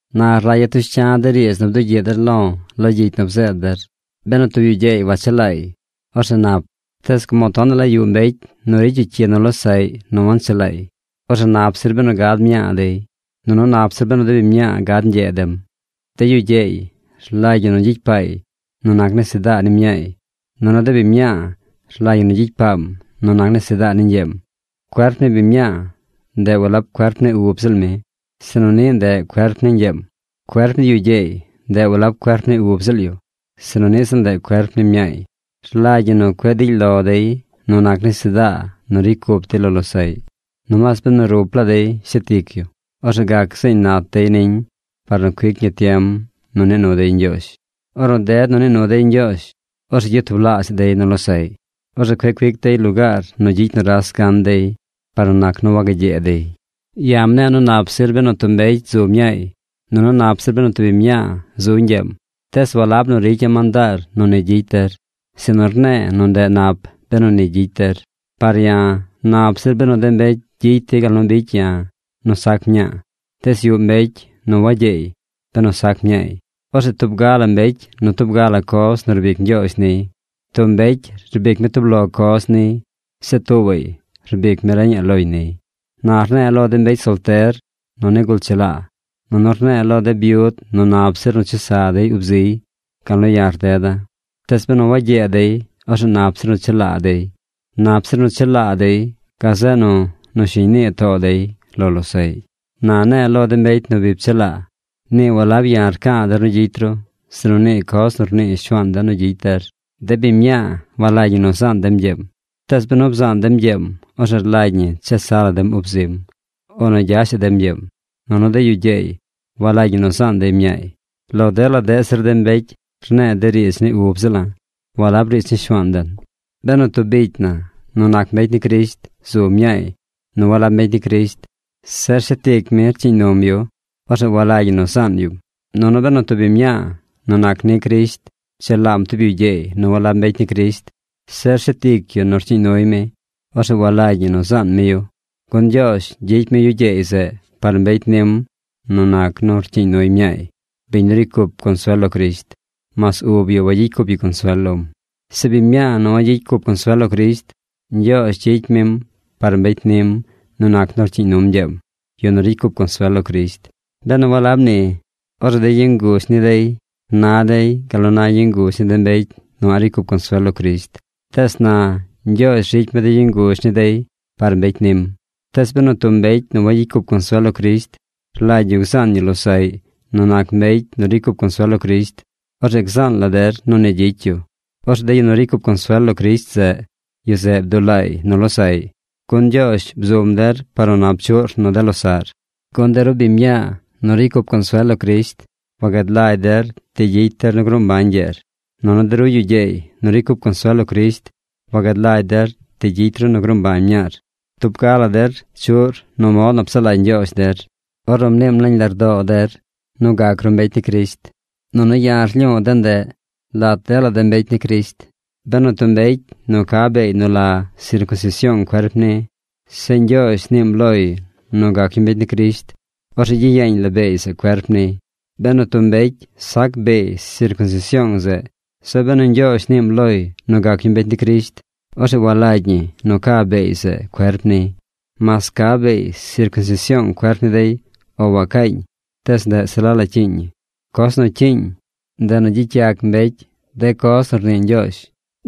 Na rlagya̱ tush cya̱ de riidz nu bdugyiꞌ der lo̱ lo gyicy nu bzeed der. Benu tub yu gyeey wachelaay, orzeꞌ nap. Tees como tonaꞌ la yuꞌ mbecy nu ricy yu cyi nu losaꞌy nu wanchalaay, orzeꞌ nap zir benu gad mñaa dey. Nunu nap zir benu de biñ mñaa gad ñgyee dem. De yu gyeey rlagy ñi nu gyicy paay nu nac nesedaa ni mñaay, nunu de biñ mñaa rlagy ñi nu gyicy paam nu nac nesedaa ni ñgyeem. Cuerp ni biñ mñaa, ndeꞌ walab cuerp ni ub ziꞌl mi sinu niꞌ ndeꞌ cuerp ni ñgyeem. Cuerp ni yu gyeey, ndeꞌ walab cuerp ni ub ziꞌl yu, sinu niꞌ ziꞌl ndeꞌ cuerp ni mñaay. Rlagy ñi nu cueꞌ dily lo dey nu nac nesedaa nu ricy cup dey lo losaꞌy. Nomaas benu rup laa dey shet ic yu, orzeꞌ gac zeeñ nat dey niñ par nu cuic ñi tiem nu nii nu dey Ñgyoozh. Ornu ded nu nii nu dey Ñgyoozh, orzeꞌ gyatublaazhaꞌ dey nu losaꞌy. Orzeꞌ cueꞌ cuic dey lugaar nu gyicy nuras gan dey par nu nac nu wagagyee dey. Ya̱ mne̱e̱ nu nap zir benu tub mbecy zu mñaay, nunu nap zir benu tub biñ mñaa zu ñgyeem, tees walab nu ricya̱ mandaar nu ni gyicy der, sinu rne̱e̱ nu ndeꞌ nap benu ni gyicy der. Par ya̱, nap zir benu de mbecy gyicy dey gal nu bicy ya̱ nu sac mña̱a̱. Tees yuꞌ mbecy nu wagyeey benu sac mñaay. Orzeꞌ tub ga la mbecy nu tub ga la coz nu rbic Ñgyoozh niy. Tub mbecy rbic mi tub lo coz niy. Zeꞌ tuubaꞌy rbic mi reñaꞌ loñ niy. Na rne̱e̱ lo de mbecy solter nu nigul chelaa, nunu rne̱e̱ lo de byud nu nap zir nu chesa dey ub ziy gal nu ya̱ rdeda̱. Tees benu wagyee dey, orzeꞌ nap zir nu chelaa dey. Nap zir nu chelaa dey, gazeꞌ nu nu shiñ nii too dey lo losaꞌy. Na ne̱e̱ lo de mbecy nu bi pchelaa. Nii walab ya̱ rca̱a̱ der nu gyicy ru, sinu nii coz nu rnii Shuaan den nu gyicy der. De biñ mñaa walagy ñi nu zaan dem ñgyeem. Tees benu bzaan dem ñgyeem, orzeꞌ rlagy ñi chesa la dem ub zim, o nu gyashaꞌ dem ñgyeem. Nunu de yu gyeey walagy ñi nu zaan dey mñaay. Lo dela deꞌ zir de mbecy rne̱e̱ de riidz ni ub ziꞌla̱, walab riidz ni Shuaan den. Benu tub bicy na nu nac mbecy ni Crisht zu mñaay nu walab mbecy ni Crisht, zeꞌ rshet ic mi rcyiiñ num yu, orzeꞌ walagy ñi nu zaan yum. Nunu benu tub biñ mñaa nu nac ni Crisht pchelaam tub yu gyeey nu walab mbecy ni Crisht, zeꞌ rshet ic yu nu rcyiiñ nuy mi, orzeꞌ walagy ñi nu zaan mi yu. Gun Ñgyoozh gyicy mi yu gyeey zeꞌ, par mbecy nim nu nac nu rcyiiñ nuy mñaay, biñ nu ricy cup consuel lo Crisht, mas ub yu wagyicy cup yu consuel lom. Zeꞌ biñ mñaa nu wagyicy cup consuel lo Crisht, Ñgyoozh gyicy mim par mbecy nim nu nac nu rcyiiñ num ñgyeem, yu nu ricy cup consuel lo Crisht. Benu walab ni orzeꞌ de yu ngush ni dey na dey gal na yu nguzh ni de mbecy nu a̱ꞌ ricy cup consuel lo Crisht. Tees na Ñgyoozh ricy mi de yu nguzh ni dey par mbecy nim. Tees benu tub mbecy nu wagyicy cup consuel lo Crisht rlagy yu gzaan yu losaꞌy nu nac mbecy nu ricy cup consuel lo Crisht, orzeꞌ gzaan la der nu ni gyicy yu. Orzeꞌ de yu nu ricy cup consuel lo Crisht zeꞌ, yu zeꞌ bdulaay nu losaꞌy. Gun Ñgyoozh bzum der par nu nap chuꞌr nu de losaꞌr. Gun de ru biñ mñaa nu ricy cup consuel lo Crisht wagad lagy der ti gyicy der nu gruu mbañ ñgyeer. Nunu de ru yu gyeey nu ricy cup consuel lo Crisht wagad lagy der ti gyicy ru nu gruu mbañ mñaar. Tub ga la der chuꞌr nu mod nu psaꞌ lagy Ñgyoozh der ornu mniim nañ lardoo der nu gac ru mbecy ni Crisht. Nunu ya̱ rlyu̱u̱ de ndeꞌ lat dela de mbecy ni Crisht. Benu tub mbecy nu ca beey nu la sircunsision cuerp niy, zeꞌ Ñgyoozh niim loy nu gac yu mbecy ni Crisht, orzeꞌ gyiyeeñ la beey zeꞌ cuerp niy. Benu tub mbecy sac beey sircunsision zeꞌ, zeꞌ benu Ñgyoozh niim loy nu gac yu mbecy ni Crisht, orzeꞌ walagy ñi nu ca beey zeꞌ cuerp niy. Mas ca beey sircunsision cuerp ni dey o wacaañ tees ndeꞌ se la la cyiiñ ñi. Coz nu cyiiñ, ndeꞌ nu gyicy yac mbecy de coz nu rnii Ñgyoozh.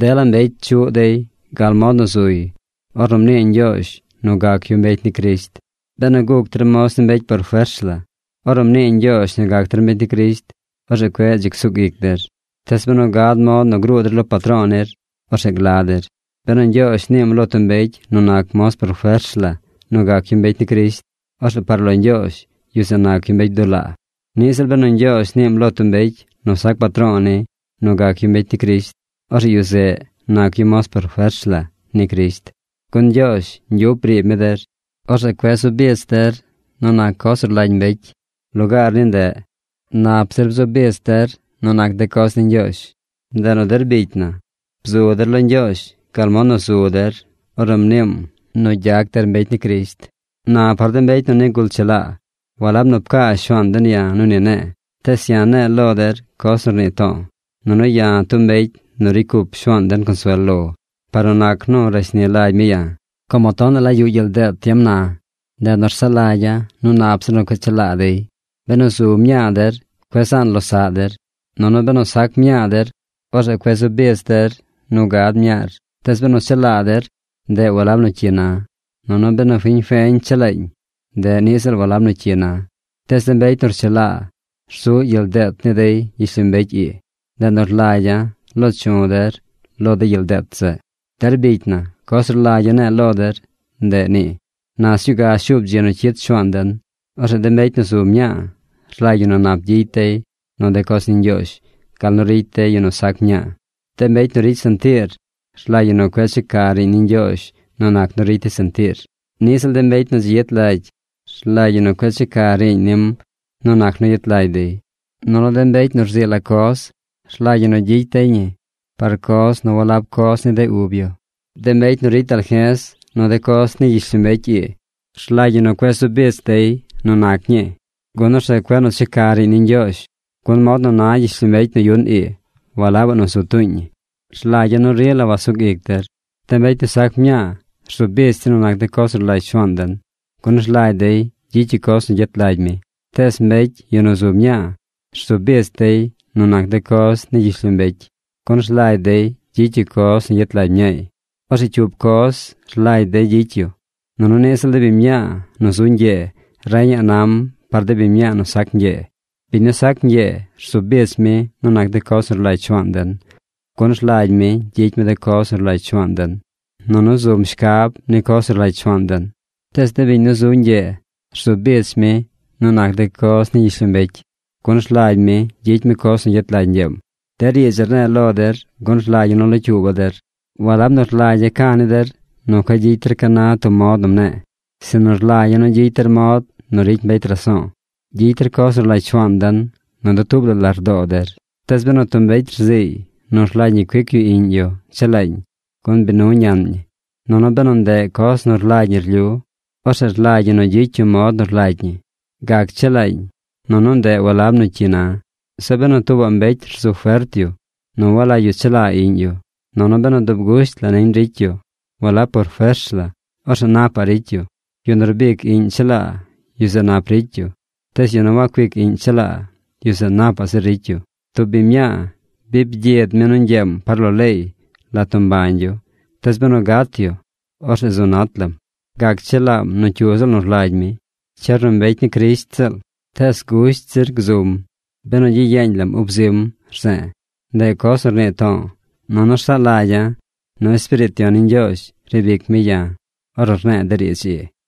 Dela mbecy chuꞌ dey gal mod nu zuy ornu mnii Ñgyoozh nu gac yu mbecy ni Crisht. Benu guc der moz ni mbecy por fers la ornu mnii Ñgyoozh nu gac der mbecy ni Crisht, orzeꞌ cueꞌ dzi csug ic der. Tees benu gad mod nu gruu der lo patro̱o̱ nir, orzeꞌ gla der. Benu Ñgyoozh niim lo tub mbecy nu nac moz por fers la nu gac yu mbecy ni Crisht, orzeꞌ par lo Ñgyoozh yu zeꞌ nac yu mbecy bdulaa. Niꞌ ziꞌl benu Ñgyoozh niim lo tub mbecy nu sac patro̱o̱ ni nu gac yu mbecy ni Crisht, orzeꞌ yu zeꞌ nac yu moz por fers la ni Crisht. Gun Ñgyoozh ñgyup briib mi der. Orzeꞌ cueꞌ zu bich der nu nac coz nu rlagy mbecy. Lugaar ni ndeꞌ, nap zir bzu bich der nu nac de coz ni Ñgyoozh. Ndeꞌ nu der bicy na, bzu der lo Ñgyoozh gal mod nu zu der ornu mniim nu gyac der mbecy ni Crisht. Na par de mbecy nu nigul chelaa, walab nu pcaa Shuaan den ya̱ nu ni ne̱e̱, tees ya̱ ne̱e̱ lo der coz nu rnii to̱o̱. Nunu ya̱ tub mbecy nu ricy cup Shuaan den consuel lo par nu nac nu rashni lagy mi ya̱. Como tonaꞌ la yuꞌ gyel deet tiem na, ndeꞌ nu rsaꞌ lagya̱ nu nap zir nu cueꞌ chelaa dey. Benu zu mñaa der, cueꞌ zaan losaꞌ der. Nunu benu sac mñaa der, orzeꞌ cueꞌ zu bich der nu gad mñaar. Tees benu chelaa der, ndeꞌ walab nu cyi na. Nunu benu fiñ feñ chelaañ, ndeꞌ niꞌ ziꞌl walab nu cyi na. Tees de mbecy nu rchelaa rzuꞌ gyel deet ni dey gyishlombecy ii. Ndeꞌ nu rlagya̱ lo̱o̱ chu̱ der lo de gyel deet zeꞌ. Der bicy na, coz nu rlagya̱ ne̱e̱ lo der, ndeꞌ nii: na sñuu ga shuub dzi nu cyid Shuaan den. Orzeꞌ de mbecy nu zu mñaa rlagy ñi nu nap gyicy dey nu de coz ni Ñgyoozh gal nu ricy de yu nu sac mñaa. De mbecy nu ricy sentiir, rlagy ñi nu cueꞌ checa riiñ ni Ñgyoozh nu nac nu ricy dey sentiir. Niꞌ ziꞌl de mbecy nu dzi yet lagy rlagy ñi nu cueꞌ checa riiñ nim nu nac nu yet lagy dey. Nunu de mbecy nu rzii la coz rlagy ñi nu gyicy dey ñi par coz nu walab coz ni de ub yu. De mbecy nu ricy dalje̱z nu de coz ni gyishlombecy ii, rlagy ñi nu cueꞌ zu bich dey nu nac ñii, gun orzeꞌ cueꞌ nu checa riiñ ni Ñgyoozh, gun mod nu na gyishlombecy nu yuꞌn ii walabaꞌ nu zu tuuñ ñi. Rlagya̱ nu rila wasug ic der. De mbecy nu sac mñaa rzu bich dey nu nac de coz nu rlagy Shuaan den, gun rlagy dey gyicy yu coz nu gyet lagy mi. Tees mbecy yu nu zu mñaa rzu bich dey nu nac de coz ni gyishlombecy, gun rlagy dey gyicy yu coz nu gyet lagy mñaay. Orzeꞌ cyup coz rlagy dey gyicy yu. Nunu niꞌ ziꞌl de biñ mñaa nu zu ñgyee reñaꞌ nam par de biñ nu sac ñgyee. Biñ nu sac ñgyee rzu bich mi nu nac de coz nu rlagy Shuaan den. Gun rlagy mi gyicy mi de coz nu rlagy Shuaan den, nunu zum shcab ni coz nu rlagy Shuaan den. Tees de biñ nu zu ñgyee rzu bich mi nu nac de coz ni gyishlombecy, gun rlagy mi gyicy mi coz nu gyet lagy ñgyeem. De riidz ii rne̱e̱ lo der gun rlagya̱ nu locyuuba̱ der. Walab nu rlagya̱ ca̱ ni der nu cueꞌ gyicy der ca na tub mod nu mne̱e̱, sinu rlagya̱ nu gyicy der mod nu ricy mbecy raso̱o̱. Gyicy der coz nu rlagy Shuaan den nu dutuub la lardoo der. Tees benu tub mbecy rziiy nu rlagy ñi cuic yu iꞌñ yu chelaañ gun bi nu ñaꞌn ñi, nunu benu ndeꞌ coz nu rlagy ñi rlyu, orzeꞌ rlagy ñi nu gyicy yu mod nu rlagy ñi. Gac chelaañ, nunu ndeꞌ walab nu cyi na. Zeꞌ benu tuubaꞌ mbecy rzu fert yu nu walagy yu chelaa iꞌñ yu, nunu benu dub gusht la niñ ricy yu, walab por fers la, orzeꞌ napaꞌ ricy yu. Yu nu rbic iꞌñ chelaa, yu zeꞌ nap ricy yu. Tees yu nu wacuic iꞌñ chelaa, yu zeꞌ napaꞌ zir ricy yu. Tub biñ mñaa bi byid mi nu ñgyeem par lo leey lat nu mbañ yu, tees benu gat yu, orzeꞌ zu nat laam. Gac chelaam nu cyu ziꞌl nu rlagy mi. Cyer nu mbecy ni Crisht ziꞌl. Tees gusht zir gzum benu gyiyeeñ lam ub zim rze̱e̱. Ndeꞌ coz nu rnii to̱o̱, nunu rsaꞌ lagya̱ nu Espiriit Yon ni Ñgyoozh riib ic mi ya̱ ornu rne̱e̱ de riidz ii.